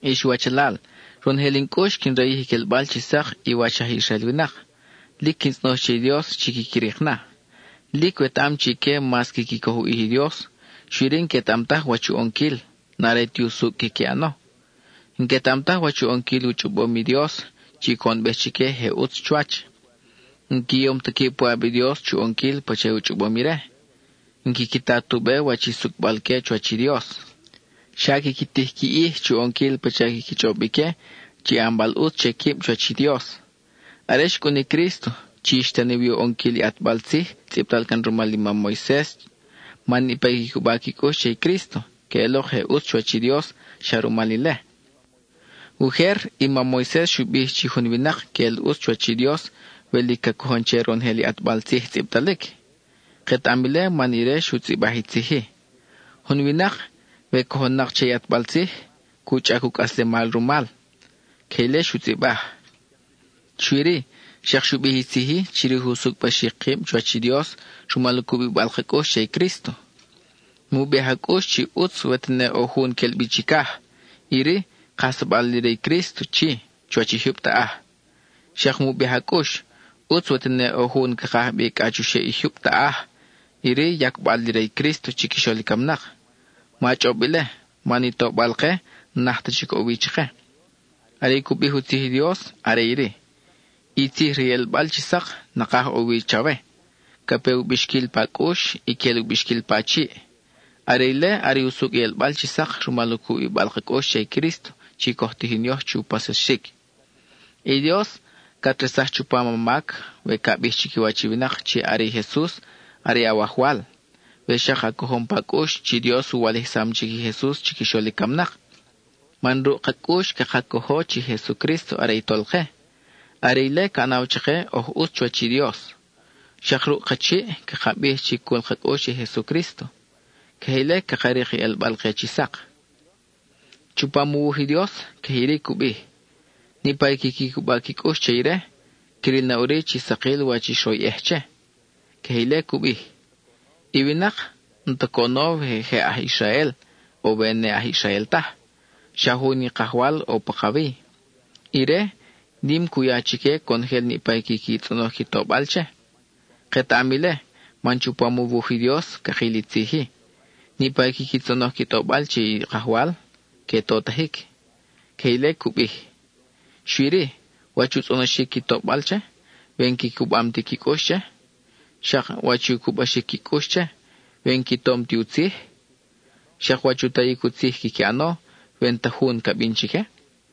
Ix wachalal, ronojel in cʼux quin rayij i quelbal chi sak i wach aj Israel winak. Lic quin tzʼonoj che i Dios chi quiqui rik na. Lic wetaʼam chi ique mas quiqui coj u ʼij i Dios, xui-ri n-quetaʼam taj wach u ʼonquil, n-are ti usucʼ quiqui ʼano. N-quetaʼam taj wach u ʼonquil u chʼobom i Dios, chi coʼonbej chique je ʼutz chuwach. N-qui yom ta quib puʼab i Dios, chu ʼonquil pacha u chʼobom ire; n-quiqui ta tu be wach i sucʼbal-que chuwach i Dios. Xa quiqui tij qui ʼij chu ʼonquil pacha quiqui chʼob ique chi ʼanbal ʼutz che quib chuwach i Dios. Are xcʼun i Crísto, chi xtani wi u ʼonquil i ʼatbal tzij tzʼibtal can rumal i mam Moises man niʼpa i quiqui cuba qui cʼux che i Crísto, que ʼelok je ʼutz chuwach i Dios xa rumal ile. Ujer, i mam Moises xu bij chi jun winak queʼel ʼutz chuwach i Dios we lic ca cojon che ronojel i ʼatbal tzij tzʼibtalic. Ketaʼam ile man ire xu tzʼibaj i tzij-i: “Jun winak, we cojon nak che i ʼatbal tzij, cu chʼac u cʼaslemal rumal.” (Queje ile xu tzʼibaj.) Xui-ri, xak xu bij i tzij-i chirij u sucʼbaxic kib chuwach i Dios rumal u cubibal ka cʼux che i Crísto: “Mu bij a cʼux chi ʼutz we tene ʼo jun quel bi chicaj,” iri: kajsabal li re i Crísto chi, chuwach i jyub taʼaj. Xak mu bij a cʼux, “ʼUtz we tene ʼo jun ca kaj bi cʼa chuxeʼ i jyub taʼaj,” iri: yacbal li re i Crísto chiquixol i camnak. (Ma chʼob ile, man i tobal-ke n-naj ta chic ʼo wi chake.) Are i cu bij u tzij i Dios are iri: “I tzij re i ʼelbal chi sak, nakaj ʼo wi chawe; ca pe u bixquil pa cʼux y quel u bixquil pa chiʼ.” Are ile are i usucʼ i ʼelbal chi sak rumal u cubibal ka cʼux che i Crísto chi coj tijin yoj chu paxsaxic. I Dios cat resaj chupam a mac we ca bij chiquiwach i winak chi are i Jesus are Awajwal, we xak a cojom pa cʼux chi Dios u walijsam chic i Jesus chiquixol i camnak. Man ruʼ ka cʼux caka cojo chi Jesucrísto are i Tolke; are ile ca ʼanaw chake oj ʼutz chuwach i Dios. Xak ruʼ ka chiʼ caka bij chi cul ka cʼux che i Jesucrísto; queje ile caka rik i ʼelbal ke chi sak. Chupam u wuj i Dios, queje iri cu bij: “Niʼpa i quiqui cuba qui cʼux che ire, cril na ʼuri chi sakil wach i xroyʼej che.” (Queje ile cu bij.) I winak, n-ta coʼono we je aj Israel, o we ne aj Israel taj, xa jun i Kajwal ʼo pakawi. Ire, nim i cu ya chique conojel niʼpa i quiqui tzʼonoj qui tobal che. Ketaʼam ile, man chupam u wuj i Dios cakil i tzij-i: “Niʼpa i quiqui tzʼonoj qui tobal che i Kajwal, que totajic.” Queje ile cu bij. Xui-ri, ¿wach u tzʼonoxic qui tobal che, we n-qui cubam ti qui cʼux che? Xak ¿wach i u cubaxic qui cʼux che, we n-qui tom ti u tzij? Xak ¿wach u tayic u tzij quiqui ʼano we n-ta jun ca bin chique?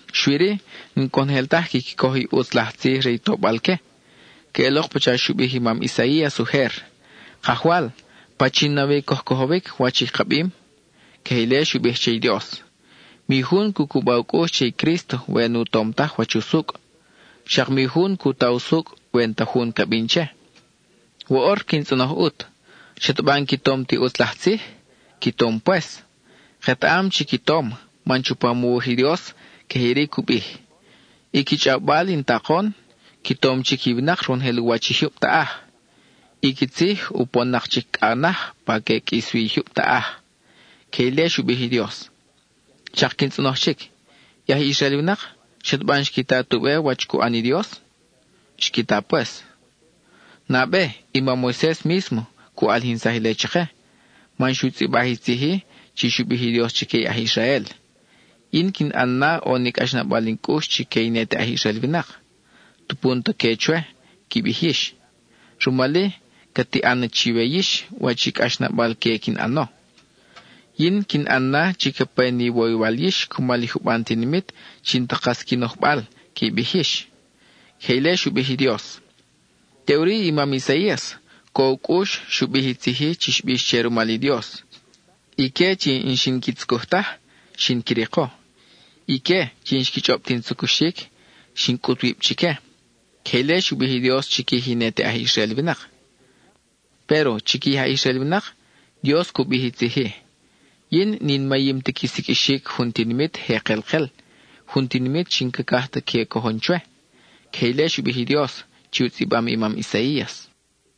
Xui-ri, n-conojel taj quiqui coj i ʼutz laj tzij re i tobal-que. Queʼelok pacha xu bij i mam Isaías ujer: “Kajwal, ¿pachin nawi coj cojowic, wach i ka bim?” (Queje ile xu bij che i Dios.) Mi jun cu cuba u cʼux che i Crísto we nu tom taj wach usucʼ. Xak mi jun cu ta usucʼ we n-ta jun ca bin che. Woʼor quin tzʼonoj ʼut: ¿Xataba n-qui tom ti ʼutz laj tzij? ¡Qui tom pues! Ketaʼam chi qui tom, man chupam u wuj i Dios queje iri cu bij: I qui chʼawbal in takon, qui tom chic i winak ronojel u wach i jyub taʼaj; i qui tzij upon-nak chic cʼa naj pa ca ʼe qʼuis wi i jyub taʼaj. (Queje ile xu bij i Dios.) Xak quin tzʼonoj chic: I aj Israel winak, ¿xataba n-xqui ta tu be wach cu ʼan ni Dios? Xqui ta pues. Nabe, i mam Moises mísmo cu ʼalijinsaj ile chake, man xu tzʼibaj i tzij-i chi xu bij i Dios chique i aj Israel: Yin quin ʼan na ʼo ni cʼaxnabal in cʼux chique i ne te aj Israel winak, tupu n-ta que chwe qui bij yix; rumal-i, ca tiʼan na chiwe yix wach i cʼax nabal-que quin ʼano. Yin quin ʼan na chi ca pe ni iwoywal yix cumal i juban tinimit chi n-ta kas qui nojbal, qui bij yix. (Queje ile xu bij i Dios.) Teʼuri i mam Isaías, co u cʼux, xu bij i tzij-i chi xbix che rumal i Dios: Ique chi n-xin qui tzucuj taj, xin qui riko; ique chi n-xqui chʼob ti in tzucuxic, xin cʼut wib chique. (Queje ile xu bij i Dios chiquij i ne te aj Israel winak.) Péro, chiquij i aj Israel winak, Dios cu bij i tzij-i: “Yin n-in mayim ti qui siqʼuixic jun tinimit je kelkel, jun tinimit chi n-cacaj ta que cojon chwe.” (Queje ile xu bij i Dios, chi u tzʼibam i mam Isaías.)